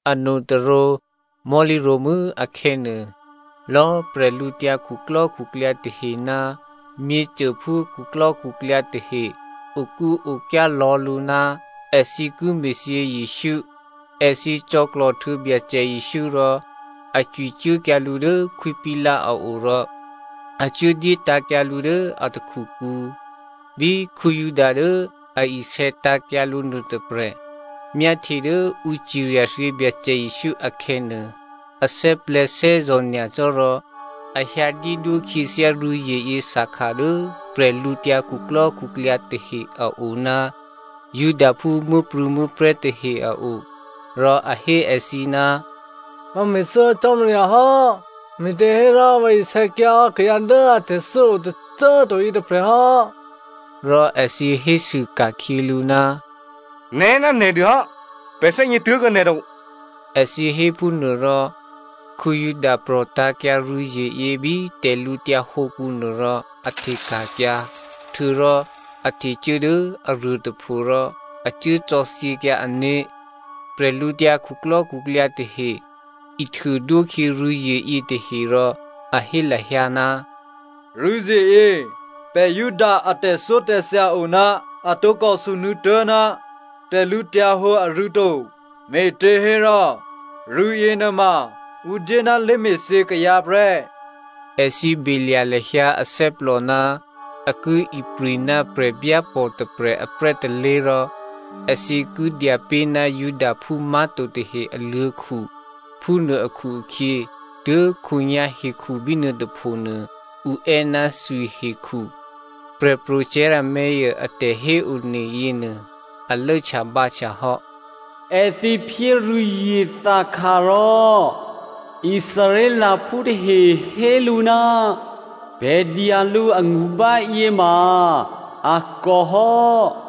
Anotôrǒ mò̤́lǐ ro̤mû́ akhè̌nuô, lò̌꤮ bwídukhu tahe ná myěcôphú khuklò́khuklyǎ tahe okúokyá lò̌ lǔ ná èthǐ ki me̤thyě Jesǔ. Èthǐ cò̌klò̤ htuô̌ Byacè Jesǔ rò a cwicuốkyǎ lǔ dố Khwí Pilato a o rò a cuốdyé tǎ̤kyǎ lǔ dố a takhukǔ. Bí Juda dố a isè̌tǎ̤kyǎ lǔ nuôtôprè̤ myáhtye dố ǔ cirya thyě Byacè Jesǔ akhè̌nuô, a thè́plè̤̌thè́zò̤ nyacò́ rò a hyǎ dyédwó khyěthyá rû̌zyeyě thakha dố bwídukhu tahe a o ná Judaphú muố̤prû̌muố̤prè̤́ tahe a o. Rò a hé èthǐ, “Vǎ me̤thû́hò́ Cò́marya hò́, me̤těhérò vǎ isè̌kyǎhò́ kayǎ dố a tè̤thû́o tôcô꤮ to yětôprè̤ hò́.” Rò èthǐ hésû ka̤khyě lǔ, “Nè̤ ná nè̤dûhò́ pè̤ thè́gně tuố̤kuô̌ nè̤ to.” Èthǐ héphúnuô rò Juda prò̤tǎ̤kyǎ rû̌zyeyě bí tè̤lǔtyǎ hǒkǔ nuô rò a hteka̤kyǎ. Htuô̌rò a htecuố dố aruô tôpho rò a cuố cò̌thyěkyǎ ané̤. Bwídukhu tahe ihtuô dwókhyě rû̌zye yětahe rò a hé lahyǎ, “Rû̌zyeyě pè̤ Juda a tè̤thyótè̤thya o ná a tǒkò sunuô̌tố̤ ná tè̤lǔhǒdu arû̌ to, me̤těhérò rû̌ yěnuôma ǔ dyé ná lé̤me̤thyě kayǎ prè́.” Èthǐ belya̤ lahyǎ athè́plò ná a ki ipri̤ ná prè̤byápò̤ tôprè̤ aprè́ tôlé̤ rò èthǐ ki dya pé̤ ná Judaphú má̤to tahe aluô̤̌khu. Phúnuô akhu-akhyě, tuố̤khǒnyá̤ hekhu bínuô tôphonuô ǔ è́ ná thwihekhu. Prè̤pro̤ Jeremia a tè̤héone yěnuô a lốhtyabǎhtya hò́, “Èthǐ phyé rû̌zye thakha rò Israelphú tahe hé lǔ, pè̤ dya lǔ angṳ báyě ma a kòhò́.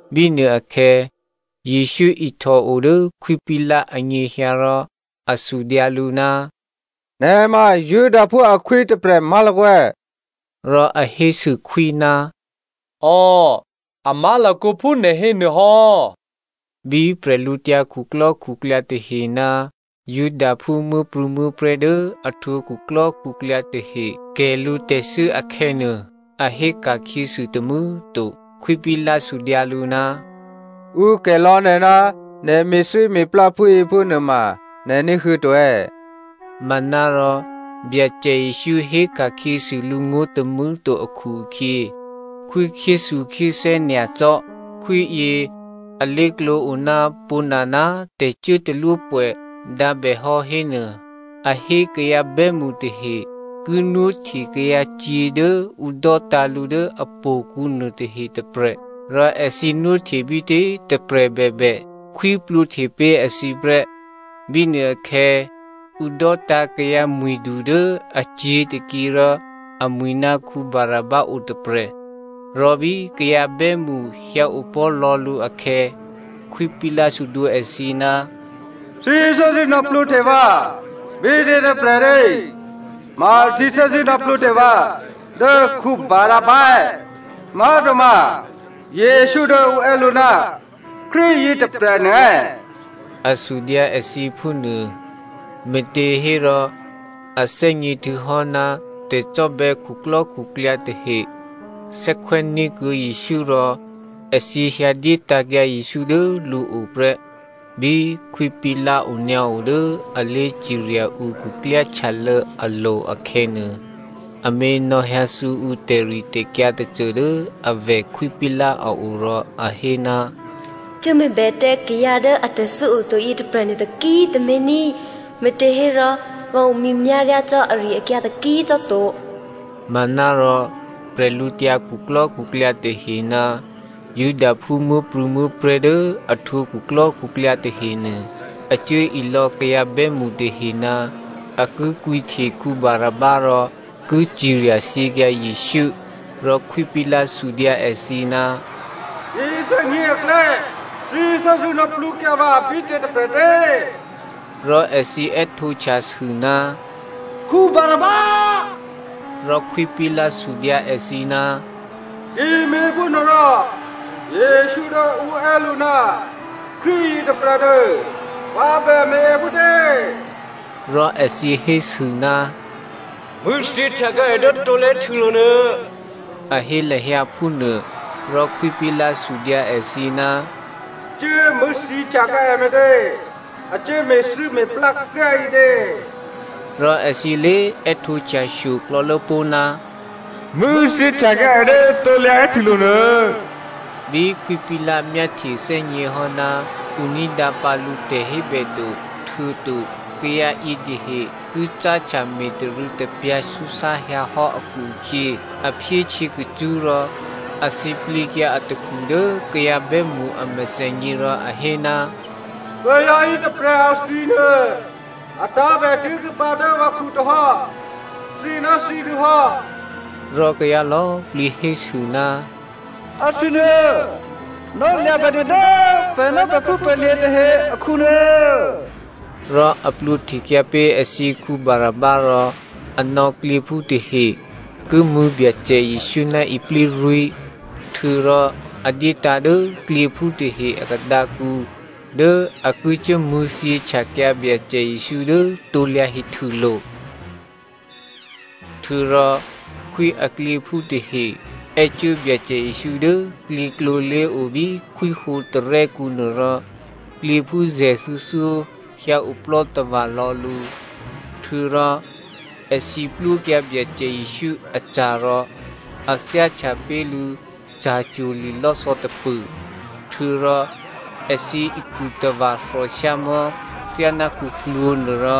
Bínuôakhè̌ Jesǔ ihtò odố Khwí Pilato anyěhyǎ rò a sudyǎ lǔ, “Nè̤ ma Judaphú akhwí tôprè̤ má̤lakǒ è̌?” Rò a hésû khwí, “Ò, a má̤lakǒ phú nè̤ hénuô hò́.” Bí bwídukhu tahe ná Judaphú muố̤prû̌muố̤prè̤́ dố a htwǒ khuklò́khuklyǎ tahe kè̤ lǔ tè̤thû́ akhè̌nuô, a hé ka̤khyěsû tômû̌꤮ to. Khwí Pilato sudyǎ lǔ, “Ǔ kè̤ lò̌ nè̤ ná nè̤ me̤thû́me̤plá phúyě phúnuôma nè̤ ní̤huô̌ to è̌?” Manárò Byacè Jesǔ héka̤khyěsû lǔ ngó̤ tômû̌꤮ to akhu-akhyě khwí khyéthukhyéthè́ nyacò́. Khwíyě alé̤klǒ o ná pwǒ̤nana꤮ tè̤cuốtalwópwè̌ dǎ bè hò́ hénuô, a hé kayǎ bè́mṳ tahe ki nwóhte kayǎcyě̤ dố ǔ dò́tǎ̤ lǔ dố htò̌kǔ nuôtahe tôprè̤. Rò èthǐ nwóhte bítě꤮ tôprè̤ bèbè, khwí plwǒhte pé̤ èthǐ prè́. Bínuôakhè̌ ǔ dò́tǎ̤ kayǎ mwi̤du dố acyě̤ tôkyě rò amwi̤ ná Barabba otôprè̤. Rò bí kayǎ bè́mṳ hyǎopò̤́ lò̌ lǔ akhè̌, Khwí Pilato sudwǒ èthǐ, “Thǐ thè́zṳ̂́ nò̌plwǒhte vǎ bítě tôprè̤tě? Ma thǐ thè́zṳ̂́ nò̌plwǒhte vǎ dố Barabba è̌? Má̤toma Jesǔ dố ǔ è́ lǔ ná Krístu yětôprè̤nuô è̌?” A sudyǎ èthǐ phúnuô. Me̤těhérò a thè́gně htuô̌hò́ ná tè̤cò́bè̌ khuklò́khuklyǎ tahe thè́khwè́ní̤kuô̌ Jesǔ rò èthǐ hyǎdyétǎ̤kyǎ Jesǔ dố lǔo prè́. Bí Khwí Pilato onyǎo dố a lé̤cirya ǔ khuklyáhtyalô̌ alo̤ akhè̌nuô, amě nò̌hyǎthǔ ǔ tè̤ritè̤kyǎ tôcô dố avè̤ Khwí Pilato a o rò a hé, “Cuốme̤bè tǎ kayǎ dố atè̤thû́ oto yětôprè̤nuô taki꤮ tǎmé̤ ní꤮, me̤těhérò vǎ omyěmyá̤ ryá cò́ ari-akyǎ taki꤮ cò́ to.” Manárò bwídukhu tahe ná Judaphú muố̤prû̌muố̤prè̤́ dố a htwǒ khuklò́khuklyǎ tahenuô a cuố ilò̌ kayǎ bè́mṳ tahe ná a ki kwǐhte Barabba rò ki cirya thyěkyǎ Jesǔ. Rò Khwí Pilato sudyǎ èthǐ, “Yěthè́nyě̤ aklè̌ thǐ thè́zṳ̂́ nò̌plwǒkyǎ vǎ bítě tôprè̤tě?” Rò èthǐ è́htǒhtyasû, “Barabba.” Rò Khwí Pilato sudyǎ èthǐ, “Ki me̤phúnuôrò Jesǔ dố ǔ è́ lǔ ná Krístu yětôprè̤nuô vǎ bè me̤ è phútě?” Rò èthǐ hésû, “Mṳ̂̌thyě htyakyǎ è dố krusulo̤ nuô,” a hé lahyǎ phúnuô. Rò Khwí Pilato sudyǎ èthǐ, “Cuố mṳ̂̌thyě htyakyǎ è me̤tě? A cuố me̤thû́me̤plá kryá꤮ ǐtě?” Rò èthǐ lé꤮ è́htǒhtyashyo klò̌lố pó̤, “Mṳ̂̌thyěhtyakyǎ è dố krusulo̤ nuô.” Bí Khwí Pilato myáhtye thè́gněhò́ ná ǔ ní̤dǎpǎ lǔ tè̤hébè to, htuô̌to kayǎ yětahe ki cáhtya me̤tarû̌tapyǎ súsá hyǎhò́ akhu-akhyě a phyé htyěkacṳ́ rò a thǐplǐkyǎ atakhu dố kayǎ bè́mṳ a mèthènyě rò a hé, “Kayǎ yětôprè̤ athwinuô a tǎ̤bè tuố̤kuô̌ pǎ dố vǎkhu tohò́. Thǐ ná thǐdûhò́.” Rò kayǎ lò̌꤮ plǐ hésû, “Athwi nuô nò̌lya̤bèdû dố pè̤ ná pè̤phúpè̤lye̤ tahe akhu nuô.” Rò a plwǒhtekyǎ pé̤ èthǐ Barabba rò a nò̌ klyěphú tahe ki mṳ̂̌ Byacè Jesǔ ná iplírwí̤, htuô̌rò a dyétǎ̤ dố klyěphú tahe a khadǎkǔ dố a ki cuố mṳ̂̌thyěhtyakyǎ Byacè Jesǔ dố krusulo̤. Htuô̌rò khwí aklyěphú tahe è́cuố Byacè Jesǔ dố klyěklǒ lé̤o bí khwíhǒ tarè́kǔnuô rò klyěphú zè̤thuô̌thyó hyǎoplò́ tava̤lò̌ lǔ. Htuô̌rò èthǐ plwókyǎ Byacè Jesǔ aca̤ rò a thyáhtya pé̤ lǔ ca̤cwo̤ li̤lò́thò̌ tôpṳ̂. Htuô̌rò èthǐ ikhu tava̤ thòshyámò̤́ thyáná khuklwǒ̤ nuôrò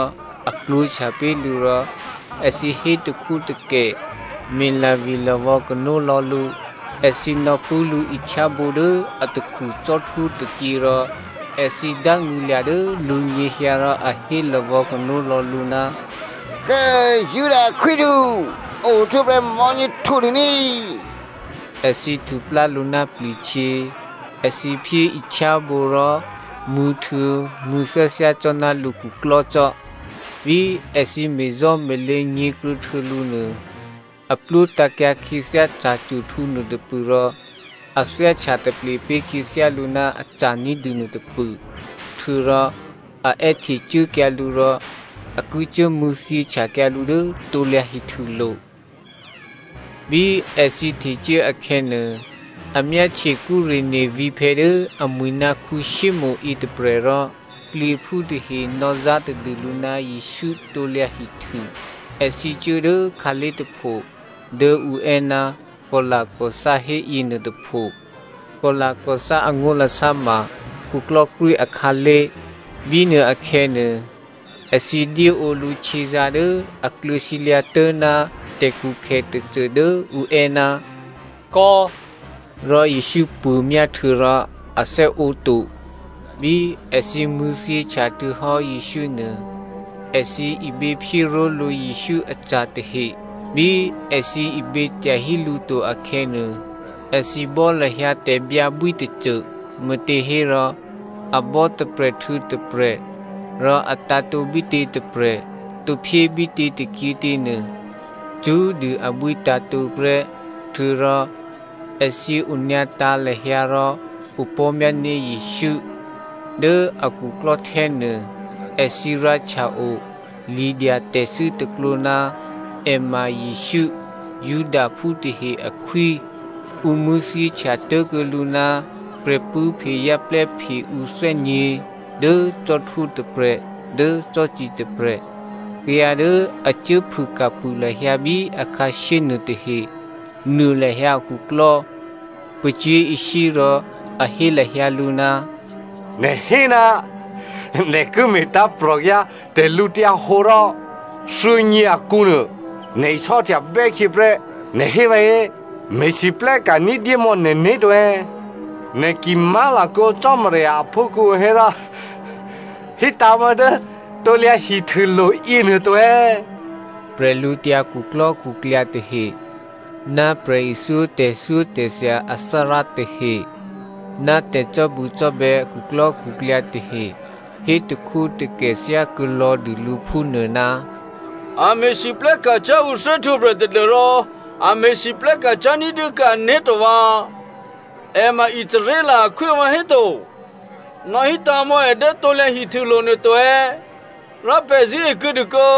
a klwǒ̤htya pé̤ lǔ rò èthǐ hé takhwótakè, me̤lavilavò̌ kano lò̌ lǔ. Èthǐ nò̌pṳ̂́ lǔ ihtyábǒ dố atakhu cò́htwó tôkyě rò èthǐ dángṳ̂lya̤ dố lǔnyěhyǎ rò a hé lavò̌ kano lò̌ lǔ, “Kố꤮ Juda akhwídu, ohtwǒprè̤ mò̤́nyě htǔdû ní꤮!” Èthǐ htuplá lǔ ná pli̤htyě, èthǐ phyé ihtyábǒ rò mṳ̂̌htuô̌ mṳ̂̌thyáthyá cò́ ná lǔ khuklò́cò́. Bí èthǐ me̤zò́me̤lě nyě̤kruô̌htuô̌ lǔ nuô a plwótǎ̤kyǎ khyěthyá ca̤cwo̤htǔ nuôtôpṳ̂ rò a thyáhtya taple pé̤ khyěthyá lǔ ná aca̤ ní̤dû nuôtôpṳ̂. Htuô̌rò a è́htecuốkyǎ lǔ rò a ki cuố mṳ̂̌thyěhtyakyǎ lǔ dố krusulo̤. Bí èthǐ htecuố akhè̌nuô, a myáhtye Cyreneo vǐ̤phè̌ dố amwi̤ ná Simonè yětôprè̤ rò klyěphú tahe nò̌zá tadû lǔ ná Jesǔ krusu. Èthǐ cuố dố khǎlé̤ tôpho dố ǔ è́ ná Goghotha hé yěnuôtôpho. (Goghotha angó̤lasá ma khuklò́krwí akhǎlé̤). Bínuô akhè̌nuô, èthǐ dyéǒ lǔ htyězǎ̤ dố a kluô̌ sǐlyǎ̤tố̤ ná tè̤khukhè tôcô dố ǔ è́, “kò̌” rò Jesǔ puô̤myá htuô̌rò a thè́ǒto. Bí èthǐ mṳ̂̌thyěhtya htuô̌hò́ Jesǔ nuô, èthǐ iběphyé ró̤lǔ Jesǔ aca̤ tahe. Bí èthǐ ibě tyahí lǔ to akhè̌nuô, èthǐ bò́ lahyǎ tè̤byǎbwí tôcô, me̤těhérò a bò́ tôprè̤ htuô̌ tôprè̤, rò a tǎ̤tǒ bítě tôprè̤ tǒ phyé bítě tôkyětě nuô, cṳ́꤮ dû abwí tǎ̤tǒ prè́. Htuô̌rò èthǐ onyǎtǎ̤ lahyǎ rò opò̤́myání̤ Jesǔ. Dố a khuklò́htè́ nuô, èthǐ rǎhtya-o lidyatè̤thû́ tôklǒ, “È ma Jesǔ, Judaphú tahe akhwí.” Ǔ mṳ̂̌thyěhtya tố̤kuô̌ lǔ ná prè̤pṳ̂́phe zè́plè́phe ǔ thè́nyě̤, dố cò́htwó tôprè̤ dố cò́ci tôprè̤. Kayǎ dố a cuốphûka̤phû lahyǎ bí akhǎshyé nuôtahe nuô lahyǎ akhuklò́, pacyé̤ishyé rò a hé lahyǎ lǔ, “Nè̤ hé ná nè̤ ki me̤tǎ̤prò̤kyǎ tè̤lǔhǒdu rò thuô̌nyě akǔ nè̤ isò́htya htuô̌bè́ khyěprè́ nè̤ hé vǎhé. Me̤lwóhteka̤ ní̤dyémò̌ nè̤né̤ to. Nè̤ ki má̤lakǒ Cò́marya aphúkhǔ hérò hítǎ̤mò̌ dố krusulo̤ yěnuô to.” Bwídukhu tahe ná prè̤ithyó tè̤thyótè̤thya athárá tahe ná tè̤cò́bucò́bè̌ a khuklò́khuklyǎ tahe hétakhwótakè thyákuô̌ lò̌ dû lǔ phúnuô, “A me̤lwóhteka̤ cyá̤ ǔ thè́htwǒprè̤ tadû́rò a me̤lwóhteka̤ cyá̤ ní̤dyékuô̌ ané̤to vǎ꤮. È ma Israel akhwí vǎhéto. Nò̌hítǎ̤ mò̌ è dố krusulo̤nuô to, rò pè̤ zṳ̂́e kuô̌dû kǒ.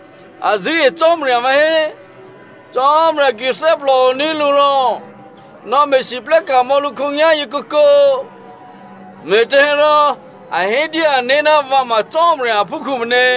A zṳ̂́e Cò́marya vǎhé. Cò́marya ki thè́plòoní̤ lǔ hérò nò̌me̤lwóhteka̤ mò̌ lǔ khǒnyá̤yěnuô kǒkǒ? Me̤těhérò a hé dyé ané̤, ‘Vǎ ma Cò́marya aphúkhǔ’ meně.”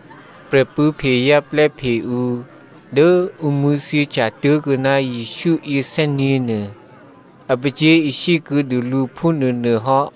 Prè̤pṳ̂́phe zè́plè́phe ǔ dố ǔ mṳ̂̌thyěhtya tố̤kuô̌ ná Jesǔ yěthè́nyě̤nuô a pacyé̤ishyé kuô̌dû lǔ phúnuônuôhò́.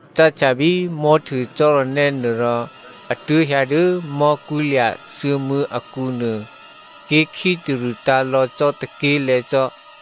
Cáhtya bí mò̤́htuô cò́ranè́ nuô rò a tuố̤hyǎ dố mò̤́kwí̤lya̤ thuô̌mû̌ akǔnuô ké̤ khítarṳ̂ tǎ̤lò̌ cò́ tôké̤lè̤̌ cò́.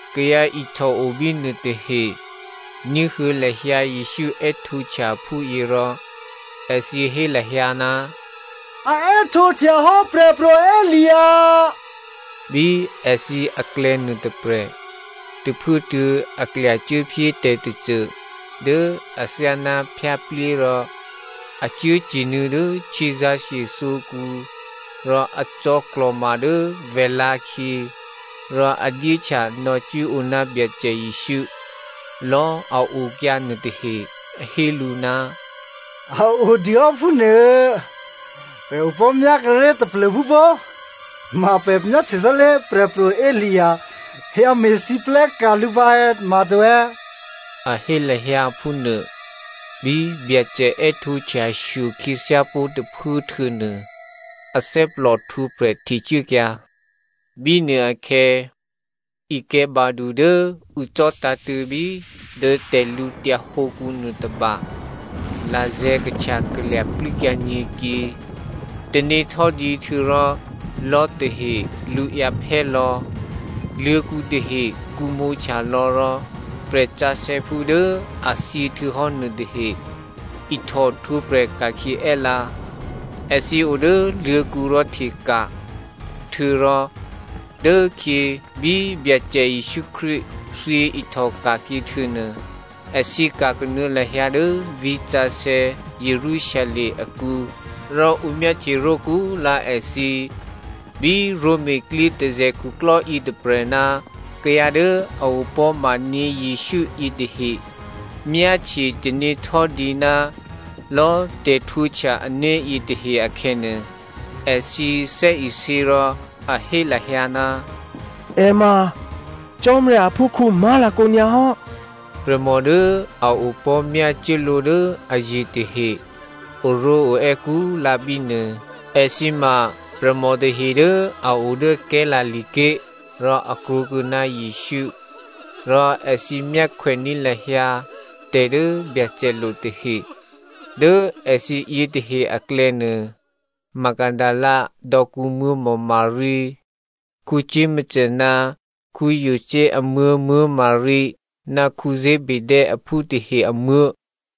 Kayǎ ihtòo bínuô tahe ní̤huô̌ lahyǎ Jesǔ è́htǒhtya phúyě rò èthǐ hé lahyǎ, “A è́htǒhtyahò́ Prè̤pro̤ Elia.” Bí èthǐ aklè̌ nuôtôprè̤, tôphuốtuô̌ a klyacuốphyé tè̤tôcô dố athyáná phyáplyé rò a cuốcye̤nuô̌ dố htyězǎ̤shye thǒkǔ rò a cò̌klò̤ma dố vèlǎ̤khyě rò a dyéhtya nò̌cwíǒ ná Byacè Jesǔ. Lò̌꤮ a okyǎ nuôtahe hé lǔ, “A o dûhò́ phúnuô, pè̤ opò̤́myá kuốré̤ taplô̤phú pó꤮, ma pè̤ myáhtye sálé̤ Prè̤pro̤ Elia hyǎ me̤lwóhteka̤ lǔ pǎ è̌, ma to è̌,” a hé lahyǎ phúnuô. Bí Byacè è́htǒhtyashyo khyěthyápó̤ tôphuố htuô̌nuô athè́plò htwǒprè̤ htecuốkyǎ. Bínuôakhè̌ ikè̤̌badu dố ǔ cò̤́tǎ̤tṳ̂̌bí dố tè̤lǔtyǎ hǒkǔ nuôtôba lazè̤̌ kahtyakalya̤ plû́kyǎ nyě̤kyě. Tanéhtò́dǐ htuô̌rò lò̤́ tahe lṳǎyǎ phè́lò̌. Luô̤̌kǔ tahe kǔmǒhtya lò̌ rò prè̤sǎsè̌phú dố a thyěhtuô̌hò́ nuôtahe ihtòhtwǒprè̤ ka̤khyě è́lǎ. Èthǐ o dố luô̤̌kǔ rò hteka̤. Htuô̌rò dố khyě bí Byacè Jesǔ Krístu thyě ihtòka̤khyě htuô̌nuô èthǐ ka̤ kanuô̌ lahyǎ dố vǐ̤sǎsè̌ Jerusalem akǔ rò ǔ myáhtye ró̤kúlǎ èthǐ. Bí Roma klyětôzè̤ khuklò́ yětôprè̤ ná kayǎ dố a opò̤́maní̤ Jesǔ yětahe myáhtye tanéhtò́dǐ ná lò̌꤮ tè̤htwǒhtya ané̤ yětahe akhè̌nuô, èthǐ thè́isě rò a hé lahyǎ, “È ma Cò́marya aphúkhǔ má̤lakǒ nyǎ hò́.” Prè̤mò dố a opò̤́ myácuốlǒ dố aye̤ tahe oró̤oè́ kúlǎ bínuô. Èthǐ ma prè̤mò tahe dố a o dố Galilea ké̤ rò a krwǒkuô̌ ná Jesǔ. Rò èthǐ myákhwèní̤ lahyǎ tè̤ dố Byacè lo tahe. Dố èthǐ yětahe aklè̌nuô Magdalena dò̌kǔmuố̤ Maria, Jakomo ná Jose amuố̤ Maria ná Zebedeo aphú tahe amuố̤.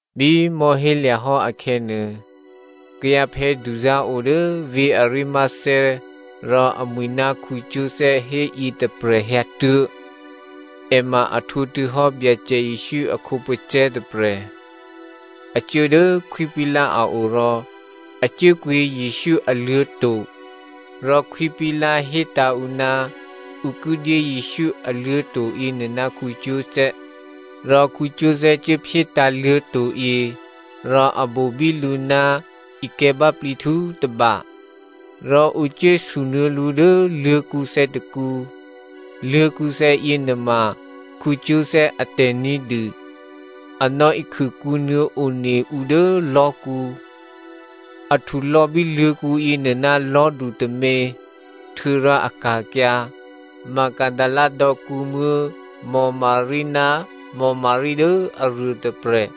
Bí mò̤́hélya̤ hò́ akhè̌nuô, kayǎphè̌duzá̤ o dố vǐ̤ Arimathea rò amwi̤ ná Joseph hé yětôprè̤ hyǎtuố̤. È ma a htwǒ htuô̌hò́ Byacè Jesǔ a khǒpacè̤̌ tôprè̤. A cuố dố Khwí Pilato a o rò a cuốkwǐ Jesǔ aluô̤̌to̤ rò Khwí Pilato hétǎ̤ ǔ ná ǔ ki dyé Jesǔ aluô̤̌to̤ yěnuô ná Joseph. Rò Joseph cuốphyétǎ̤ luô̤̌to̤yě rò a bobí lǔ ná ikè̤̌báplǐhtǔ tôba. Rò ǔ cuốsunuô̌ lǔ dố luô̤̌kǔthè̌ tôkǔ. Luô̤̌kǔthè̌ yěnuôma Joseph atè̤ ní̤dû. A nò̌ikhûkǔnuô̌ one ǔ dố lò̤́kǔ. A htulò̌bí luô̤̌kǔ yěnuô ná lò̤́du tômě htuô̌rò a ka̤kyǎ. Magdalena dò̌kǔmuố̤ Maria ná Maria dố aruôtôprè̤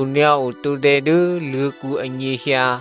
onyǎo tǒdè̌ dố luô̤̌kǔ anyěhyǎ.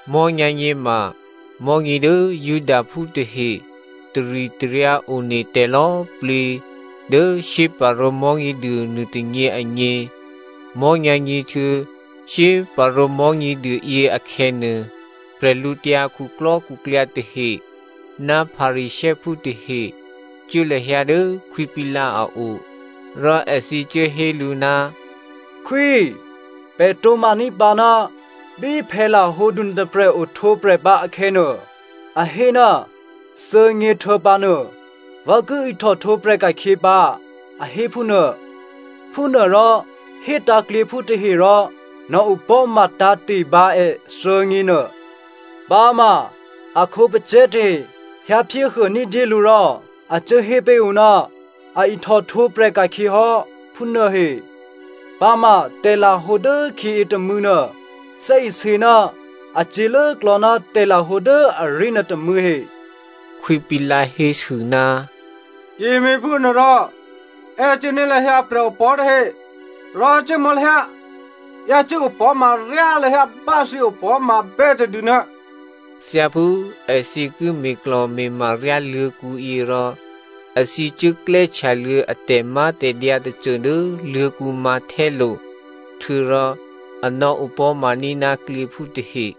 Mò̤́nyǎ̤nyě ma mò̤́nyě dố Judaphú tahe taritaryǎ one tè̤lò̌꤮ plǐ dố shyéparǒ Mò̤́nyěduô nuôtônyě agně. Mò̤́nyǎ̤nyě htuô̌ shyéparǒ Mò̤́nyěduô yě akhè̌nuô, bwídukhu tahe ná Pharisěophú tahe cuố lahyǎ dố Khwí Pilato a o. Rò èthǐ cuố hé lǔ, “Khwí꤮ pè̤ tǒ̤maní̤ pǎ ná bí phè̌lahǒdu nuôtôprè̤ ohtwǒprè̤pǎ akhè̌nuô, a hé, ‘Thuô̌nyěhtuô̌pǎ nuô, vǎ ki ihtòhtwǒprè̤ ka̤khyě pǎ,’ a hé phúnuô. Phúnuôrò hétǎ̤ klyěphú tahe rò nò̌opò̤́ma tǎ̤te̤ bǎ è thuô̌nyěnuô. Pǎma a khǒpacè̤̌ tahe hyǎphyéhuô ní̤dyé lǔ rò a cuố hé pé̤ ǔ ná a ihtòhtwǒprè̤ ka̤khyě hò́꤮, phúnuôhe. Pǎma tè̤lahǒ dốkhyě yětômû̌ nuô thè́isě ná a cyě̤lốklò̌ ná tè̤lahǒ dố aré̤ nuôtômû̌ he.” Khwí Pilato hésû, “Ki me̤phúnuôrò è́cuốní̤ lahyǎ prè̤opò̤́ tahe rò cuốmò̌ lahyǎ, yácû́ opò̤́ma ryá lahyǎ bá꤮ thǐ opò̤́mabè́ tadû nuô.” Thyáphú èthǐ ki me̤klò̤me̤ma ryá luô̤̌kǔyě rò èthǐ cuốklè́htya luô̌ a tè̤mátè̤dyǎ tôcô dố luô̤̌kǔ mǎ̤htè́lo̤ htuô̌rò a nò̌opò̤́maní̤ ná klyěphú tahe.